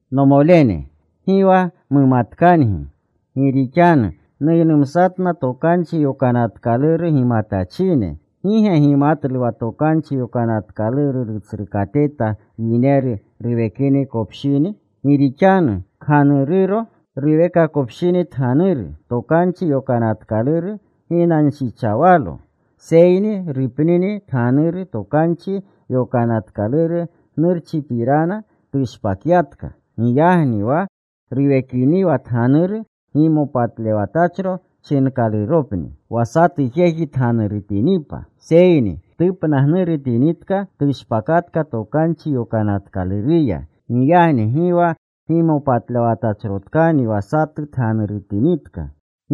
Nomolene, gi wa mumatkangi, gi rixanu nuynumsatna Tokanchi Yokanatkaluru gimatachine. ¿Gi ge gimatlu wa Tokanchi Yokanatkaluru rutsrukateta yineru ruwekakopshini? Gi rixanu kganururo, ruwekakopshini tganuru, Tokanchi Yokanatkaluru ginanshichawalo. Seyni rupnini tganuru, Tokanchi Yokanatkaluru gnurchipirana tushpakyatka. Giyagni wa ruwekiniwa tganuru, gimopatlewatachro chinkaluropni wa satu jeji tganurutinipa. Seyni tupnagnurutinitka tushpakatka Tokanchi Yokanatkaluruya. Giyagni gi wa gimopatlewatachrotkani wa satu tganurutinitka.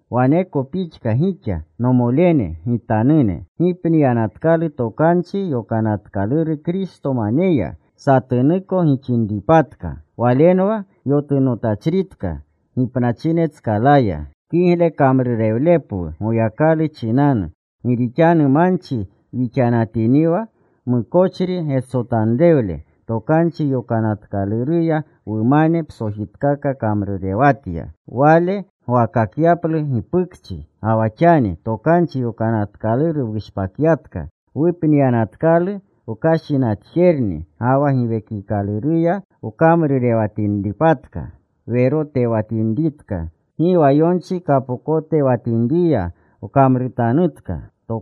Waneko pixka gixa, nomolene gitanune, gipniyanatkalu Tokanchi Yokanatkaluru Kristomaneya, satunuko gixinripatka, walenwa yotunotachritka gipnachinetskalaya, kigle kamrurewlepwu Goyakalu chinanu. Gi rixanu manchi wixanatiniwa, mukochri getsotanrewle, Tokanchi Yokanatkaluruya, wumane psojitkaka kamrurewatya. Wale gwakakyaplu gipukchi. Ga wa xani Tokanchi Yokanatkaluru wushpakyatka. Wupniyanatkalu wkashinatjerni, ga wa Giwekikaluruya wkamrurewatinripatka. Werotewatinritka. Gi wa yonchi kapokotewatinriya wkamrutanutka.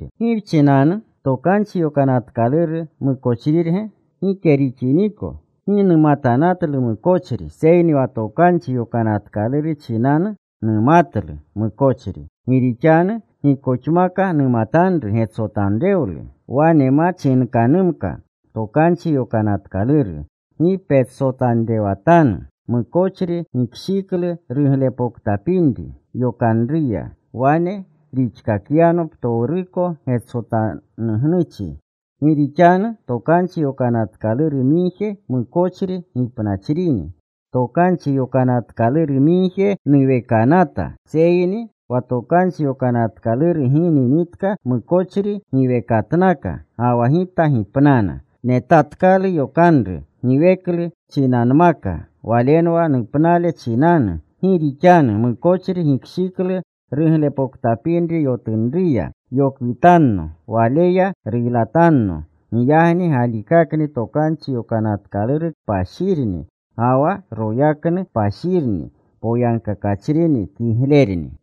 ¿Gi wchinanu? ¿Tokanchi Yokanatkaluru mukochrirge? Gike rixiniko. Gi numatanatlu mukochri, seyni wa Tokanchi Yokanatkaluru chinanu numatlu mukochri. Gi rixanu gikoxmaka numatanru getsotanrewlu, wane ma chinkanumka Tokanchi Yokanatkaluru: Gi petsotanrewatanu. Mukochri gikshiklu ruglepoktapinri yokanruya. Wane rixkakyano ptowruko getsotanugnuchi. Gi rixanu Tokanchi Yokanatkaluru migje mukochri gipnachrini. Tokanchi Yokanatkaluru migje nuwekanata. Seyni wa Tokanchi Yokanatkaluru gininitka, mukochri giwekatnaka, ga wa gita gipnana. Netatkalu yokanru giweklu chinanmaka, walenwa nupnale chinanu. Gi rixanu mukochri gikshiklu ruglepoktapinri yokanruya. Yokwitanno. Waleya ruylatanno. Giyagni galikakni Tokanchi Yokanatkaluru kpashirni, ga wa yokanru kpashirni, poyagkakachrini, kiglerni.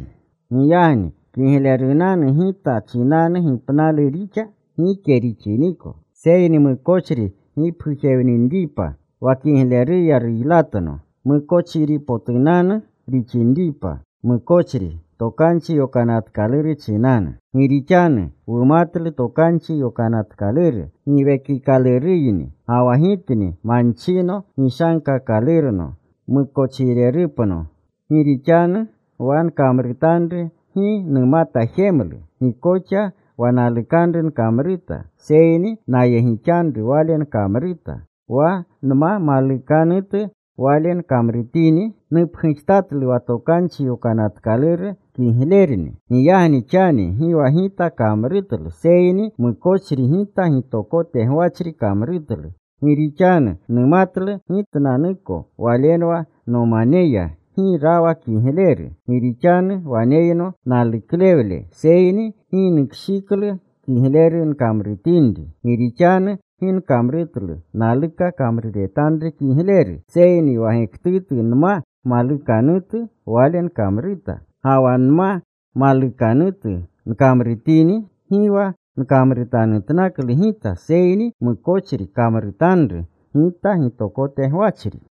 Giyagni ¿kiglerunanu gita chinanu gipnalu rixa? Gike rixiniko. Seyni mukochri mukochri gipgujewninripa wa kigleruya ruylatno, mukochripotunanu rixinripa mukochri Tokanchi Yokanatkaluru chinanu. Gi rixanu wumatlu Tokanchi Yokanatkaluru Giwekikaluruyni. Ga wa gitni manchino, gishankakalurno mukochrinupno. Gi rixanu wa nkamrutanru gi numata jemlu. Gi koxa wa nalukanru nkamruta. Seyni nayegixanru wale nkamruta. Wa nma malukanutu wale nkamrutini, nupgujtatlu wa Tokanchi Yokanatkaluru kiglerni. Giyagni xani gi wa gita kamrutlu, seyni mukochri gita gitokote gwachri kamrutlu. Gi rixanu numatlu gitnanuko, walenwa nomaneya, gi rawa kigleru. Gi rixanu waneyno naluklewle, seyni gi nukshiklu kigleru nkamrutinri. Gi rixanu gi nkamrutlu naluka kamruretanru kigleru. Seyni wa gektutu nma malukanutu wale nkamruta. Ga wa nma malukanutu nkamrutini, gi wa nkamrutanutkalu gita, seyni mukochri kamrutanru gita gitokote gwachri.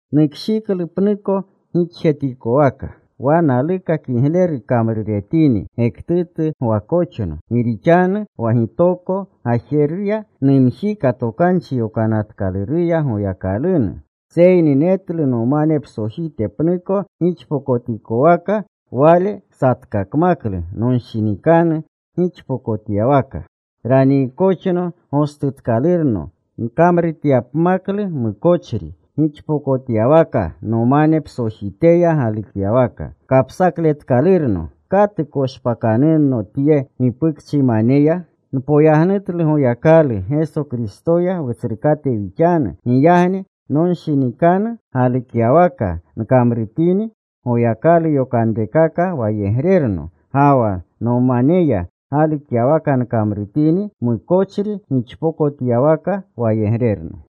Nukshiklu pnuko gixjetikowaka: wa naluka kigleru kamruretini, gektutu gwakoxno. Gi rixanu wa gitoko gajeruya numjika Tokanchi Yokanatkaluruya Goyakalunu. Seyni netlu nomane psojite pnuko gixpokotikowaka. Wale satkakmaklu nonshinikanu gixpokotyawaka. Raniikoxno gostutkalurno nkamrutyapmaklu mukochri gixpokotyawaka nomane psojiteya galukyawaka. ¡Kapsakletkalurno! ¿Katu koshpakanunno tye gipukchimaneya? Npoyagnutlu Goyakalu, Geso Kristoya Wutsrukate wixanu. Giyagni nonshinikanu galukyawaka nkamrutini, Goyakalu yokanrekaka wayegrerno. Ga wa nomaneya galukyawaka nkamrutini, mukochri gixpokotyawaka wayegrerno.